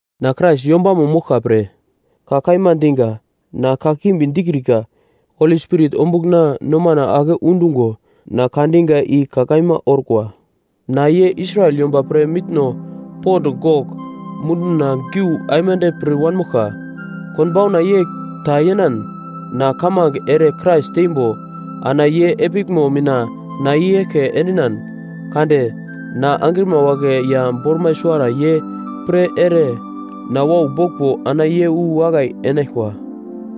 Na Krais yombamo moglka pre ka kaima diga, na kakimbi dikrika. Holi Spirit ombugl na nomana ake undungo na ka diga i ka kaima orkwa. Na, ye Israel yomba pre mitno pond gogl munduna giu aimande pir wanmoglka. Konbauna yegl ta yenan, na kamange ere Krais tembo, ana ye epiglmo mina na i-eglke endinan kade na angrima wagle ya bormai suwara ye pre ere na wau boglmbo ana ye wu wakai enaglkwa.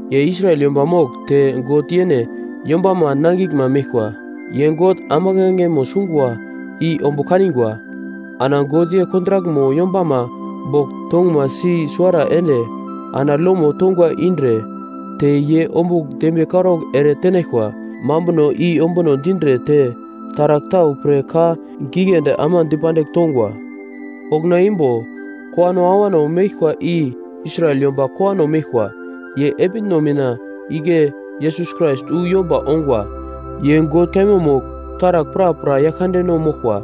Ye Israel yomba mogl te God yene yombama nangiglma meglkwa. Ye God ambuglangemo sungwa i ombugl kanigwa. Ana God ye kontrakmo yombama bogl tonguma si suwara ende ana lomo tongwa indre te ye ombugl dembiye karaugl ere tenaglkwa mambuno i ombuno dindre te taragl tau pre ka giglendi ama dipandigl tongwa. Okuna imbo kowano awano meglkwa i Israel yomba kowano meglkwa, ye epitno mina igle Yesus Krais wu yomba ongwa. Ye God kaima mogl taragl prapra Yaglkandeno moglkwa.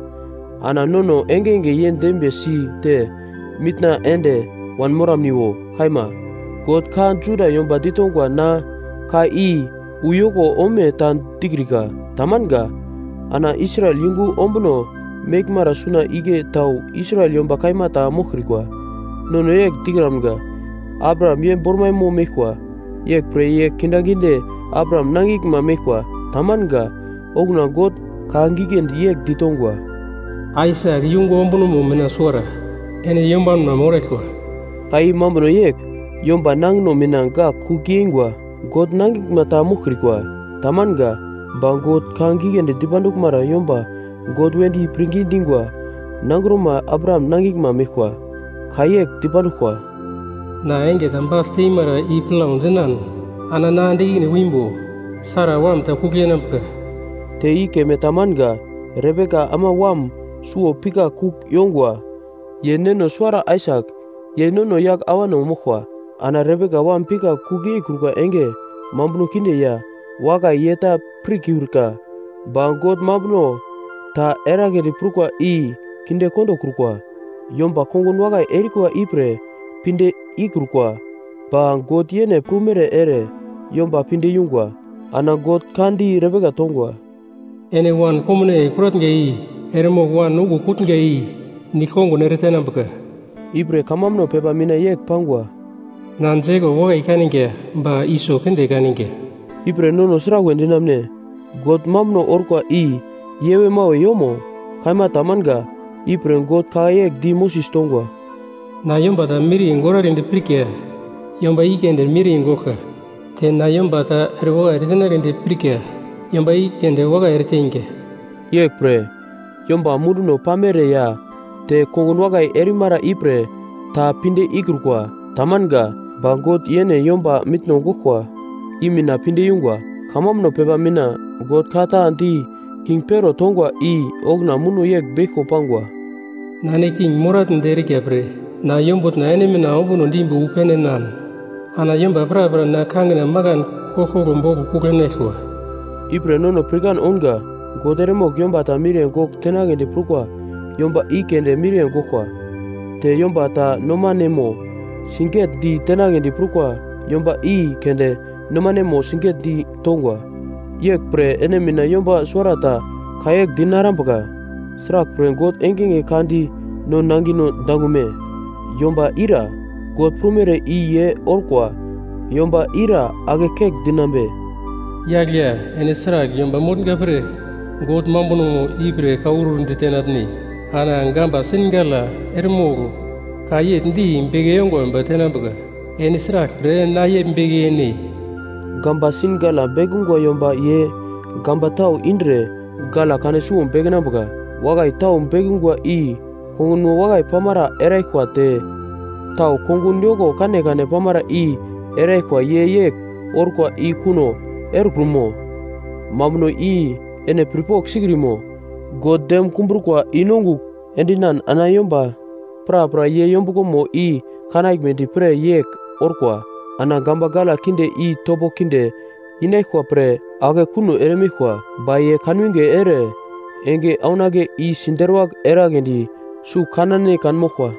Ana nono engenge ye dembiye si te mitna ende wanmoramniwo! Kaima. God ka Juda yomba ditongwa na ka i uyoko ome ta dikrika. Tamanga! Ana Israel yungu ombuno meglmara suna igle tau Israel yomba kaima ta moglkrikwa. Nono yegl dikramga, “Abraham ye bormaimo meglkwa. Yeglpre ye kindaginde Abraham nangiglma meglkwa.” Tamanga! Okuna God ka giglendi yegl ditongwa, “Aisak yungu ombunomo mina suwara ene yombanma moraglkwa.” Ka i mambuno yegl. Yomba nangino mina gak kugl yeingwa, God nangiglma ta moglkrikwa. Tamanga! Ba God ka giglendi dipanduglmara yomba God wedi pirngi dingwa nangroma Abraham nangiglma meglkwa. Ka yegl dipanduglkwa: “Na enge ta bagl teimara i plau dinan ana na ende ikine wimbo, Sara wam ta kugl yenambuka.” Te i keme ta manga, Rebeka ama wam suwo pikagl kugl yongwa. Ye neno suwara Aisak, ye nono yagl awano moglkwa. Ana Rebeka wam pikagl kugl yeikrukwa enge mambuno kinde ya wakai ye ta pirkiurka. Ba God mambuno ta eragledi prukwa i kinde kondokrukwa, yomba kongun wakai erikwa ipre pinde ikrukwa, ba God yene prumere ere yomba pinde yungwa. Ana God ka di Rebeka tongwa, “Ene wan komnaiye kuratnga i eremogl wan okuwo kutnga i nigl-kongun ere tenambuka.” Ipre kamambuno pepa mina yegl pangwa, “Na Jekop wakai kaninga ba Iso kinde kaninga.” Ipre nono sragl we dinamune? God mambuno orkwa i yewe-mawe yomo? Kaima tamanga! Ipre, God ka yegl di Moses tongwa, “Na yomba ta miriye goragledi pirka yomba i keunde miriye goglka. Te na yomba ta erewakai ere tenagledi pirka yomba i keunde wakai ereteinga.” Yeglpre, yomba munduno pamere ya te kongun wakai erimara ipre ta pinde ikrukwa. Tamanga. Ba God, yene yomba mitno goglkwa i mina pinde yungwa. Kamambuno pepa mina God ka ta di king Pero tongwa i okuna muno yegl beglko pangwa, “Na, ene king moratnedi erika pre na yombutna ene mina ombuno dimbo wu pene enan ana yomba prapra na kangina makan koglkoglo boglo kugl enaglkwa.” Ipre nono pirkan ounga: God eremogl yomba ta miriye gogl tenagledi prukwa yomba i keunde miriye goglkwa. Te yomba ta nomaneno sigetdi tenagledi prukwa yomba i keunde nomaneno siget-ditongwa. Yeglpre ene mina yomba suwarata ka yegl dinarambuka, “Sraglpre God engenge ka di no nangino dangume? Yomba ire, God prumere i ye orkwa yomba ira ake kegl dinambe?” Yagl ya, ene sragl yomba motnga pre God mambunomo ipre kaurur ditenatne? Ana gamba sin gala eremogl ka yegl di beke yongwa yomba tenambuka, “Ene sraglpre na yegl beke yene?” Gamba sin gala bekungwa yomba ye gamba tau indre gala kane suwo bekenambuka, wakai tau bekungwa i kongunmo wakai pamara eraglkwa te tau kongun yoko kanekane pamara i eraglkwa ye yegl orkwa i kuno erekrumo? Mambuno i ene pirpogl sikrimo? God dem kumbrukwa i-nongugl endinan ana yomba prapra ye yombuglomo i kanaglmedi pre yegl orkwa. Ana gamba gala kinde i topo kinde inaglkwa pre ake kuno eremeglkwa. Ba ye kanwinge ere enge aunake i siderwagl eragledi sugl kanane kanmoglkwa.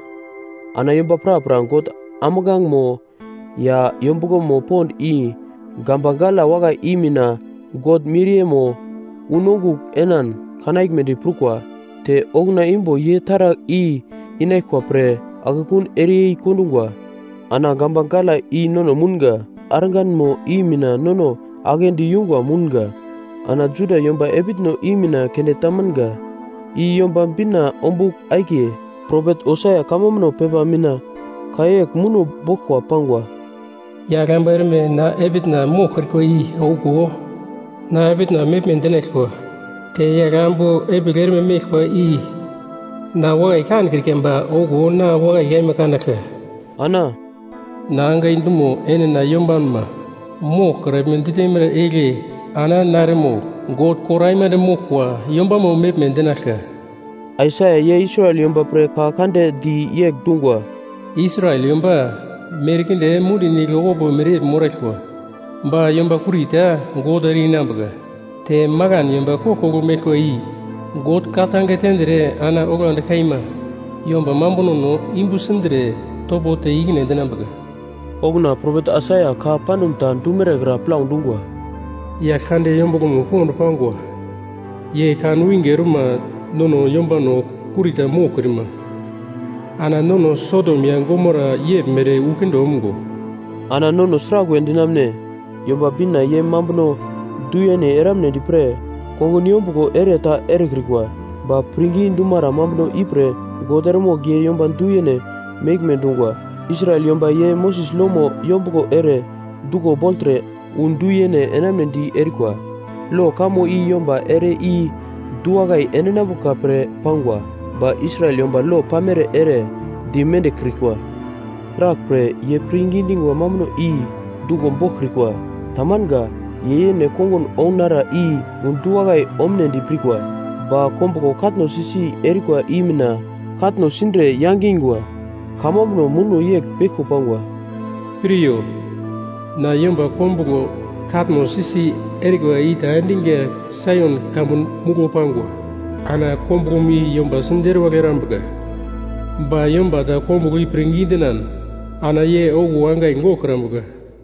Ana yomba prapra God ambuglangemo ya yombuglomo pond i gamba gala wakai i mina God miriyemo unongugl enan kanaglmedi prukwa. Te okuna imbo ye taragl i inaglkwa pre akekun ereyei kondungwa. Ana gamba gala i nono mounga, God arganmo i mina nono aglendi yungwa mounga. Ana Juda yomba epitno i mina keunde tamanga! I Yomba Bina ombugl akiye. Propet Hosea kamambuno pepa mina ka yegl muno boglkwa pangwa: “Yagl ambu erme na epitna moglkrikwa i okuwo na epitna meglme dinaglkwa. Te yagl ambu epigl erme meglkwa i na wakai kankrika ba okuwo na wakai kaima kanaglka.” Ana, “Na angai dumo ene na yombanma moglkraglme ditemara igle ana na eremogl God kor aimande moglkwa yombama meglme dinaglka!” Aisaia ye Israel yomba pre ka kande di yegl dungwa: “Israel yomba merkinde mundi nigl okupo mereyegl moraglkwa, ba yomba kurita God ere-inambuka. Te makan yomba koglkoglo meglkwa i God ka-tange tendre ana oglandi kaima yomba mambunono yumbu sindre topo te ikine endinambuka.” Okuna propet Aisaia ka pandum ta dumere kra plau dungwa: “Yaglkande yombuglomo pond pangwa ye kanwinge orma nono yombano kurita moglkrima ana nono Sodom ya Gomara yeglmere wu kinde omgo.” Ana nono sraglwe dinamune? Yomba Bina ye mambuno du-yene eramunedi pre kongun yombuglo ere ta erekrikwa, ba pirngi dumara mambuno ipre God eremogl ye yomba du-yene meglme dungwa. Israel yomba ye Moses lomo yombuglo ere duglo bogltre wu du-yene enamunedi erikwa. Lo kamo i yomba ere i du-wakai endinambuka pre pangwa, ba Israel yomba lo pamere ere di mendiglkrikwa. Sraglpre, ye pirngi dingwa mambuno i duglo boglkrikwa. Tamanga. Ye yene kongun ounara i wu du-wakai omunedi pirkwa, ba kombuglo katno si-si erikwa i mina katno sindre yangungwa. Kamambuno muno yegl beglko pangwa: “Piryo, na yomba kombuglo katno si-si erikwa ita endinga Saion kamun muglo pangwa. Ana kombuglomo i yomba si deruwagl erambuka, ba yomba ta kombuglo i pirngi dinan ana ye okuwo angai goglkrambuka.”